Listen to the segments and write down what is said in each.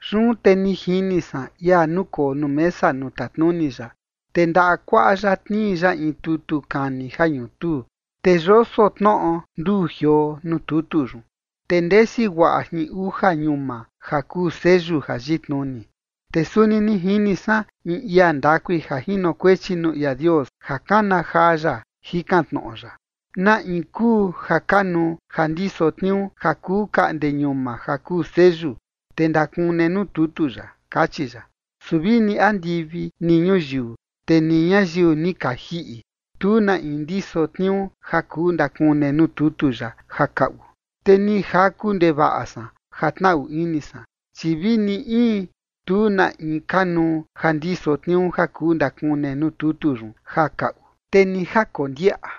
Yun te ni jini san ia nukoo nuu mesa nuu tatnuni ya, te ndaꞌa kuaꞌa ya tnii ya in tutu kani ja ñutuu. Te yoso tnoꞌo nduu jioo nuu tutu yun, te ndesi guaꞌa jin uja ñuma ja kuu seyu ja yitnuni. Te suni ni jini san in ia ndakui ja jinokuechi nuu ia Dios ja kana jaa ya, jikan tnoꞌo ya: ―¿Na in kuu ja kanuu ja ndiso tniuu ja kuu kaꞌnde ñuma ja kuu seyu, te ndakune nuu tutu yaꞌa? ―kachi ya. Su vini andivi ni ñuyiu, te ni ñayiu ni ka jiꞌi, tu na in ndiso tniuu ja kuu ndakune nuu tutu yaꞌa ja kaꞌu. Te ni jaku ndevaꞌa san ja tnaꞌu ini san, chi vi ni in tu na in kanuu ja ndiso tniuu ja kuu ndakune nuu tutu yun ja kaꞌu, te ni ja kondiaꞌa.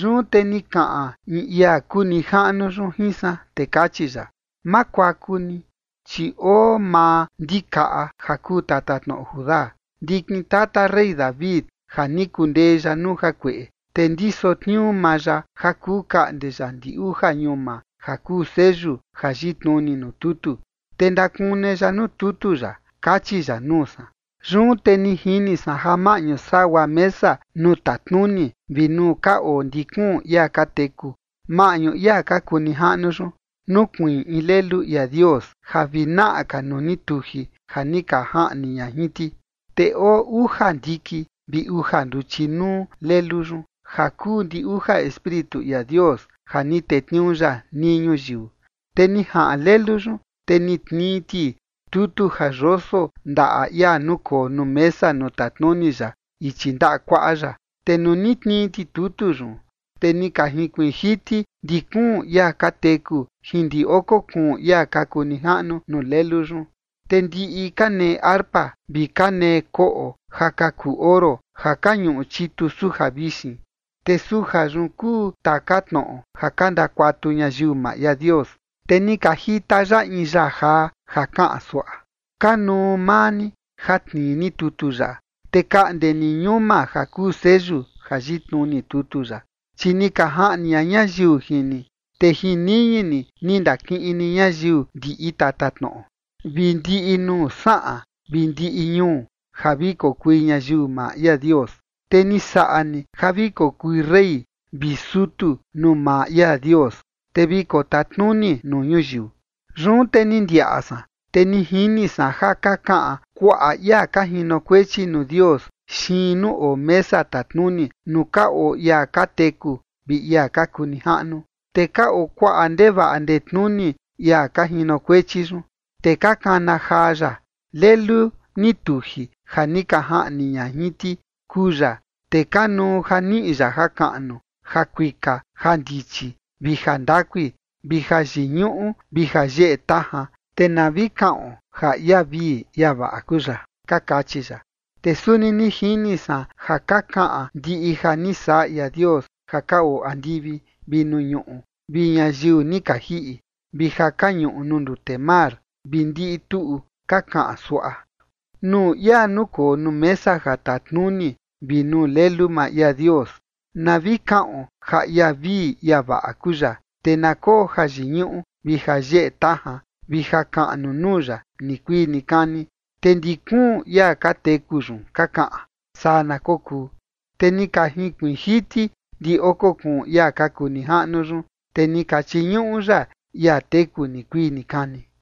Yun te ni kaꞌan in ia kuu nijaꞌnu yun jin san, te kachi ya: ―Ma kuaku ni, chi oo maa Ndikaꞌa ja kuu tatatnoꞌo Judá, ndikin tata rey David, ja ni kundee ya nuu jakueꞌe, te ndiso tniuu maa ya ja kuu kaꞌnde ya ndi uja ñuma ja kuu seyu ja yitnuni nuu tutu, te ndakune ya nuu tutu yaꞌa ―kachi ya nuu san. Yun te ni jini san ja maꞌñu sagua mesa nuu tatnuni vi nuu ka oo ndi kuun ia ka teku, maꞌñu ia ka kuu nijaꞌnu yun, nukuiin in Lelu ia Dios ja vi naꞌa ka nuu ni tuji ja ni ka jaꞌni ña jin ti. Te oo uja ndiki vi uja nduchi nuu Lelu yun, ja kuu ndi uja espíritu ia Dios ja ni tetniuu ya nii ñuyiu. Te ni jaꞌan Lelu yun, te ni tnii ti tutu ja yoso ndaꞌa ia nukoo nuu mesa nuu tatnuni ya ichi ndaꞌa kuaꞌa ya. Te nuu ni tnii ti tutu yun, te ni ka jinkuiin jiti ndi kuun ia ka teku jin ndi oko kuun ia ka kuu nijaꞌnu nuu Lelu yun. Te ndiꞌi ka nee arpa, vi ka nee koꞌo ja ka kuu oro, ja ka ñuꞌu chitu suja vixin, te suja yun kuu taka tnoꞌo ja ka ndakuatu ñayiu maa ia Dios. Te ni ka jita ya in yaa jaa, ja kaꞌan suaꞌa: Kanuu maa ni, ja tnii ni tutu yaꞌa, te kaꞌnde ni ñuma ja kuu seyu ja yitnuni tutu yaꞌa. Chi ni ka jaꞌni ña ñayiu jin ni, te jin niñi ni ni ndakiꞌin ni ñayiu ndiꞌi tatatnoꞌo, vi ndiꞌi nuu saꞌan vi ndiꞌi ñuu, ja vi kokui ñayiu maa ia Dios. Te ni saꞌa ni ja vi kokui rey vi sutu nuu maa ia Dios, te vi kotatnuni nuu ñuyiu. Yun te ni ndiaꞌa san, te ni jini san ja ka kaꞌan kuaꞌa ia ka jinokuechi nuu Dios xiin nuu oo mesa tatnuni, nuu ka oo ia ka teku vi ia ka kuu nijaꞌnu. Te ka oo kuaꞌa ndevaꞌa ndetnuni ia ka jinokuechi yun. Te ka kana jaa ya: Lelu ni tuji ja ni ka jaꞌni ña jin ti kuu ya. Te kanuu ja niꞌi ya jakaꞌnu, jakuika, jandichi, vi jandakui, vi jayiñuꞌu vi jayeꞌe tajan, te na vi kaꞌon ja ia vii ia vaꞌa kuu ya. Ka kachi ya. Te suni ni jini san ja ka kaꞌan ndiꞌi ja ni saꞌa ia Dios ja ka oo andivi vi nuu ñuꞌu, vi ñayiu ni ka jiꞌi, vi ja ka ñuꞌu nuu ndute mar, vi ndiꞌi tuꞌu ka kaꞌan suaꞌa: Nuu ia nukoo nuu mesa ja tatnuni vi nuu Lelu maa ia Dios, na vi kaꞌon ja ia vii ia vaꞌa kuu ya, te na koo jayiñuꞌu vi jayeꞌe tajan vi jakaꞌnu nuu ya nikuii nikani. Te ndi kuun ia ka teku yun ka kaꞌan: ―Saa na kokuu. Te ni ka jinkuiin jiti ndi oko kuun ia ka kuu nijaꞌnu yun, te ni ka chiñuꞌu ya ia teku nikuii nikani.